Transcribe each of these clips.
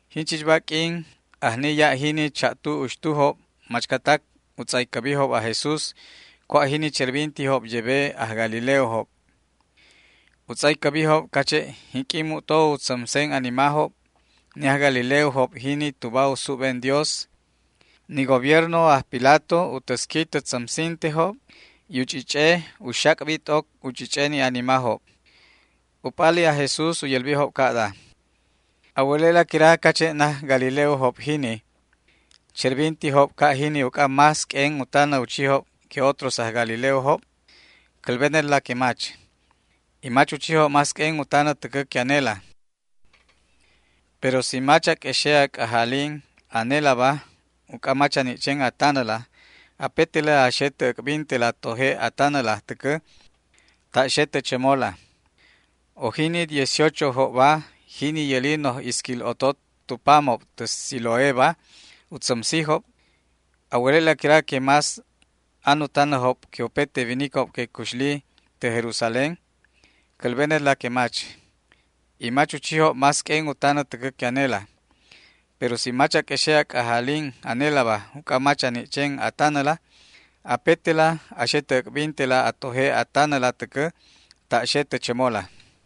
Jinchichba q'uin ajni ya' jini cha'tu uxtujob machcatac u tz'aycäbijob aj Jesús cua' jini cherbintijob yebe aj galileojob. U tz'aycäbijob cache' jinq'uin mu'to u tzämsen animajob ni aj galileojob jini tuba u súbben Dios, ni gobierno aj Pilatoba u täsqui tä tzämsintejob y u ch'ich'eba u xac'bi t'oc u ch'ich'e ni animajob. U p'ali aj Jesús u yälbijob ca'da: ―¿A wäle'la quira cache' naj galileojob jiniba cherbintijob ca' jini uc'a más q'uen u tanä u chijob que otros aj galileojob? Cälbenetla que mach, y mach u chijob más q'uen u tanä täcä que anela. Pero si mach a q'uexe' a c'ajalin anelaba uc'a mach a ni' chen a tanäla, apetela a xe tä äc'bintela a toje' a tanäla täcä ta' xe tä chämola. ¿O jini dieciochojobba, jini yäli noj isquil otot tu pamob tä Siloéba u tzämsijob, a wäle'la quira que más an u tanäjob que upete winicob que cuxlijob tä Jerusalénba? Cälbenetla que mach, y mach u chijob más q'uen u tanä täcä que anela. Pero si mach a q'uexe' a c'ajalin anelaba uc'a mach a ni' chen a tanäla, apetela a xe tä äc'bintela a toje' a tanäla täcä ta' xe tä chämola.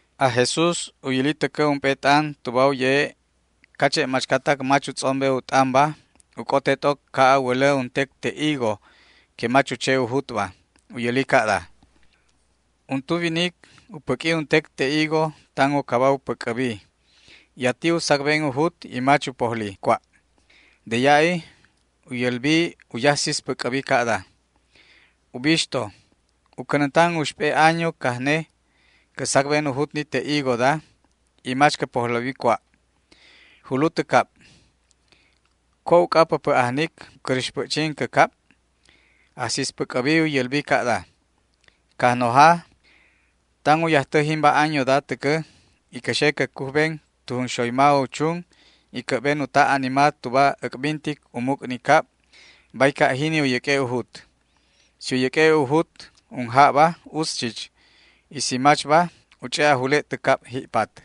Aj Jesús u yäli täcä ump'e t'an tuba u ye'e' cache' machcatac mach u tz'ombe u t'anba u c'ote t'oc ca' a wälä untec te' higo que mach u che u jutba. U yäli ca'da: ―Untu winic u cänänti untec te' higo päc'ä uc'a tan u caba u päc'äbi, y ati u sacben u jut y mach u pojli cua'. De ya'i u yälbi u yajsispäc'äbi ca'da: “Ubixto, u cänäntan uxp'e año acajne cä sacben u jut ni te' higoda y mach cä pojläbi cua'. Julu tä cab. ¿Cua' uc'a päpä' ajnic u cräx päc'chin cä cab?” Ajsispäc'äbi u yälbi ca'da: “Cajnoja, tan u yajtä jimba añoda täcä y cä xe cä cujben tu junxoyma u chun y cä'ben u ta' anima tuba äc'bintic u muc' ni cab, bay ca' jini u yäq'ue' u jut. Si u yäq'ue' u jut unjabba utz chich, y si machba u ch'e' a jule' tä cab ji'pat”.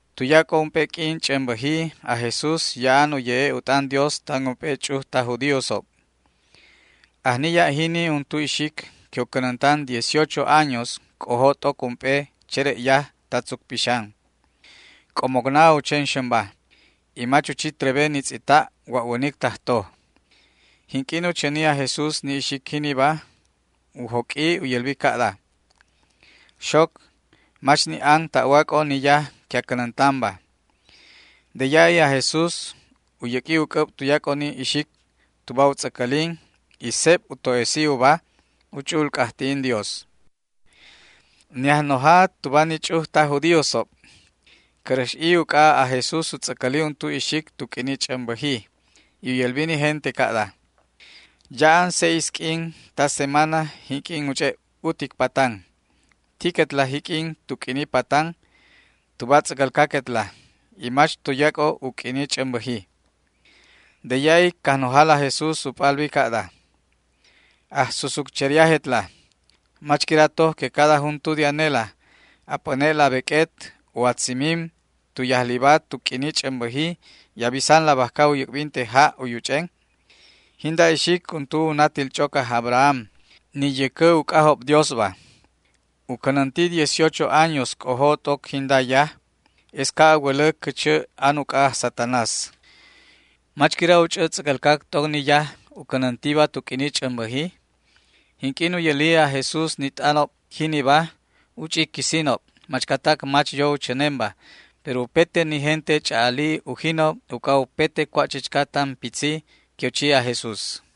Tuyac'o ump'e q'uin ch'ämbäji aj Jesús ya'an u ye'e' u t'an Dios tan ump'e ch'uj taj judíosob. Ajni ya' jini untu ixic que u cänäntan dieciocho años c'ojo t'oc ump'e chere'yaj ta tzuc pixan. C'omocna u chen xämba, y mach u chi trebe ni tz'ita' wa'wänic tajtoj. Jinq'uin u chäni aj Jesús ni ixic jiniba u joq'ui u yälbi ca'da: ―Xoc, mach ni' an ta'wac'o ni yaj que a cänäntanba. De ya'i aj Jesús u yäq'ui u c'äb tuyac'o ni ixic tuba u tz'äcälin y seb u to'esi uba u ch'u'ul c'ajti'in Dios. Ni ajnoja tuba ni ch'uj taj judíosob cäräx'i uc'a aj Jesús u tz'äcäli untu ixic tu q'uini ch'ämbäji, y u yälbi ni gente ca'da: ―Ya'an seis q'uin ta semana jinq'uin u ch'e' utic patan. Tiquetla jiq'uin tu q'uini patanba tuba tz'äcälcaquetla y mach tuyac'o u q'uini ch'ämbäjiba. De ya'i Cajnojala aj Jesús u p'albi ca'da: ―Ajsusutcheriajetla, ¿mach quira toj que cada juntu de anela a p'äne'la a beq'uet o a tzimim tu yajliba tu q'uini ch'ämbäji y a bisanla bajca u yäc'binte ja' u yuch'en? Jinda ixic untu u natil ch'oc aj Abraham, ni yäcä uc'ajob Diosba. U cänänti dieciocho años c'ojo t'oc jinda yaj, es ca' a wälä cächä an uc'a aj Satanás. ¿Mach quira u ch'ä tz'äcälcac t'oc ni yaj u cänäntiba tu q'uini ch'ämbäji? Jinq'uin u yäli aj Jesús ni t'anob jiniba u ch'i quisinob machcatac mach yo u chänenba, pero upete ni gente ch'a'ali ujinob uc'a upete cua' chichca tan pitzi que u chi aj Jesús.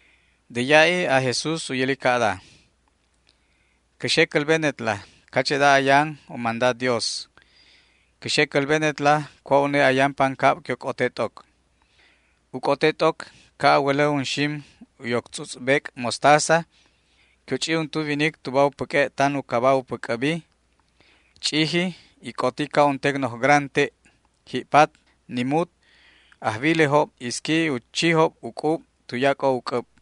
De ya'i aj Jesús u yäli ca'da: ―Cä xe cälbenetla cache'da ayan u manda Dios. Cä xe cälbenetla cua' une ayan pancab que u c'ote t'oc. U c'ote t'oc ca' a wälä unxim u yoc tz'utz' bec' mostaza que u ch'i untu winic tuba u päq'ue' tan u caba u päc'äbi. Ch'iji y c'oti ca' untec noj gran te'. Ji'pat ni mut ajwilejob isqui u chijob u c'ub tuyac'o u c'äb.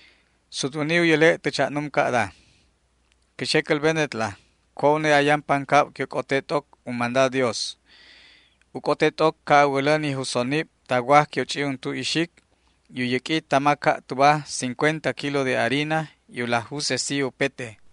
Sutwäni u yäle' tä cha'num ca'da: ―Cä xe cälbenetla cua' une ayan pancab que u c'ote t'oc u manda Dios. U c'ote t'oc ca' a wälä ni jusonib ta waj que u ch'i untu ixic y u yäq'ui tama ca' tuba cincuenta kilo de harina y u laj jusesi upete.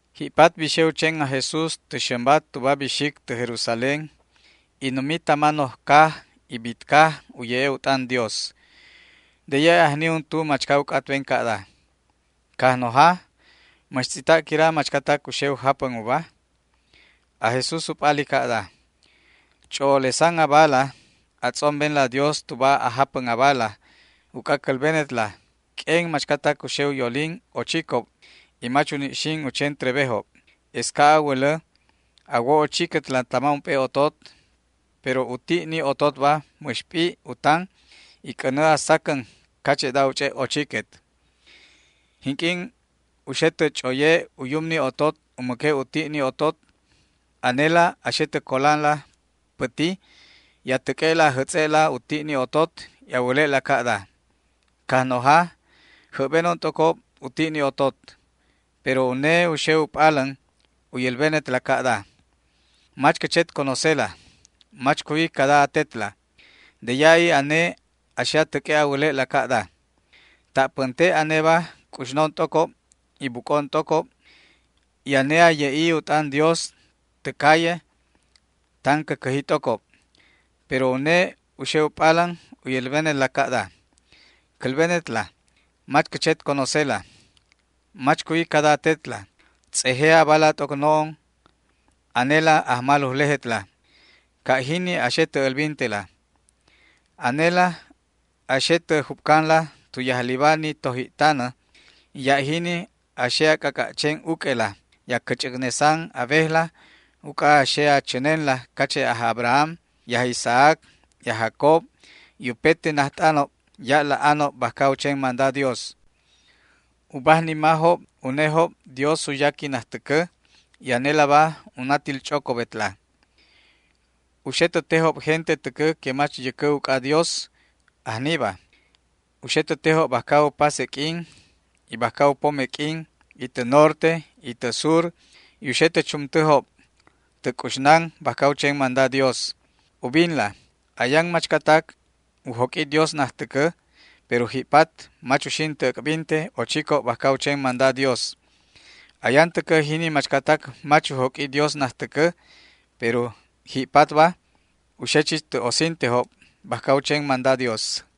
Ji'pat bixe u chen aj Jesús tä xämba tuba bixic tä Jerusalén y numi tama noj caj y bit caj u ye'e' u t'an Dios. De ya'i ajni untu machca u c'atben ca'da: ―Cajnoja, ¿mäx tz'ita' quira machcatac u xe u japän uba? Aj Jesús u p'ali ca'da: ―Ch'o'olesan abala a tz'ombenla Dios tuba a japän abala, uc'a cälbenetla q'uen machcatac u xe u yolin ochicob y mach uni' xin u chen trebejob. Es ca' a wälä a wo ochiquetla tama ump'e otot, pero u ti' ni ototba mäx p'i' u tan y c'änä a sacän cache'da u ch'e' ochiquet. Jinq'uin u xe tä ch'oye u yum ni otot u mäque' u ti' ni otot, anela a xe tä colanla päti y a täq'ue'la a jätz'e'la u ti' ni otot y a wäle'la ca'da: “Cajnoja, jäbbenon t'ocob u ti' ni otot”. Pero une u xe u p'alän u yälbenetla ca'da: “Mach cä chet conocela, mach cuwi cada atetla”. De ya'i ane a xe a täq'ue' a wäle'la ca'da: “Ta' pänte' aneba c'uxnon t'ocob y buc'on t'ocob, y ane a ye'i u t'an Dios tä calle tan cä cäji t'ocob”. Pero une u xe u p'alän u yälbenetla ca'da: “Cälbenetla mach cä chet conocela, mach cuwi cada atetla, tz'eje abala t'oc no'on anela ajmalujlejetla”. Ca' jini a xe tä älbintela. Anela a xe tä jup'canla tu yajliba ni toji'tanä y ya' jini a xe a c'ac'a' chen uq'uela y a cäch'äcnesan a wejla uc'a a xe a chänenla cache' aj Abraham y aj Isaac y aj Jacob y upete najt'anob ya' laj anob bajca u chen manda Dios. U bajnimajob unejob Dios u yaqui najtäcä y anelaba u natil ch'ocobetla. U xe tä tejob gente täcä que mach yäcä uc'ajob Dios ajniba. U xe tä tejob bajca u pase q'uin y bajca u pome q'uin y tä norte y tä sur, y u xe tä chumtäjob tä c'uxnan bajca u chen manda Dios. Ubinla, ayan machcatac u joq'ui Dios najtäcä, pero ji'pat mach uxin tä äc'binte ochicob bajca u chen manda Dios. Ayan täcä jini machcatac mach u joq'ui Dios najtäcä, pero ji'patba u xe chich tä osintejob bajca u chen manda Dios.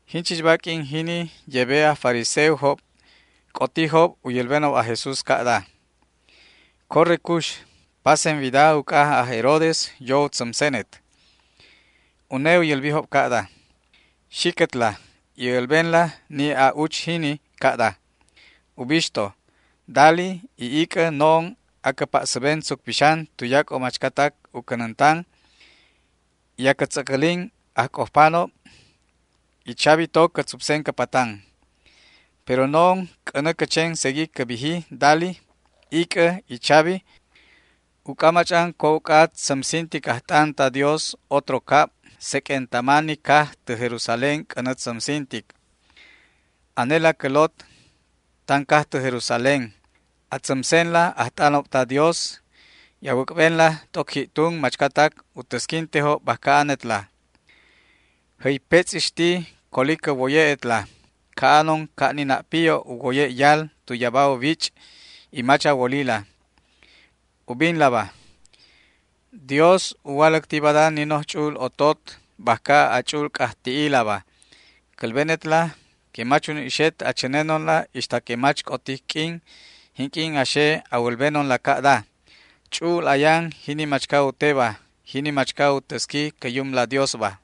Jinchichba q'uin jini yebe aj fariseojob c'otijob u yälbenob aj Jesús ca'da: ―Corre cux, pasen wida uc'a aj Herodes yo u tzämsenet. Une u yälbijob ca'da: ―Xiquetla y älbenla ni a'uch jini ca'da: “Ubixto, dali y ic'ä no'on acä pa'säben tzuc pixan tuyac'o machcatac u cänäntan y acä tz'äcälin ajc'ojpanob, y chabi to cä tzupsen cä patan”. Pero no'on c'änä cä chen segui cä biji dali, ic'ä y chabi, uc'a mach'an cua' uc'a tzämsintic ajt'an ta Dios otro cab, seq'uen tama ni caj tä Jerusalén c'änä tzämsintic. ’Anela cä lot tan caj tä Jerusalén, a tzämsenla ajt'anob ta Dios y a wäc'benla t'oc ji'tun machcatac u täsquintejob bajca anetla. ¡Jäypetz'ixti coli cä woye'etla ca'anon ca' ni na' piyo' u woye' yal tu yaba u wich', y mach a wolila! Ubinlaba, Dios u waläcti bada ni noj ch'u'ul otot bajca a ch'u'ul c'ajti'ilaba. Cälbenetla que mach uni' xet a chänenonla ixta que mach c'otic q'uin jinq'uin a xe a wälbenonla ca'da: “Ch'u'ul ayan jini machca u teba, jini machca u täsqui cä Yumla Diosba”.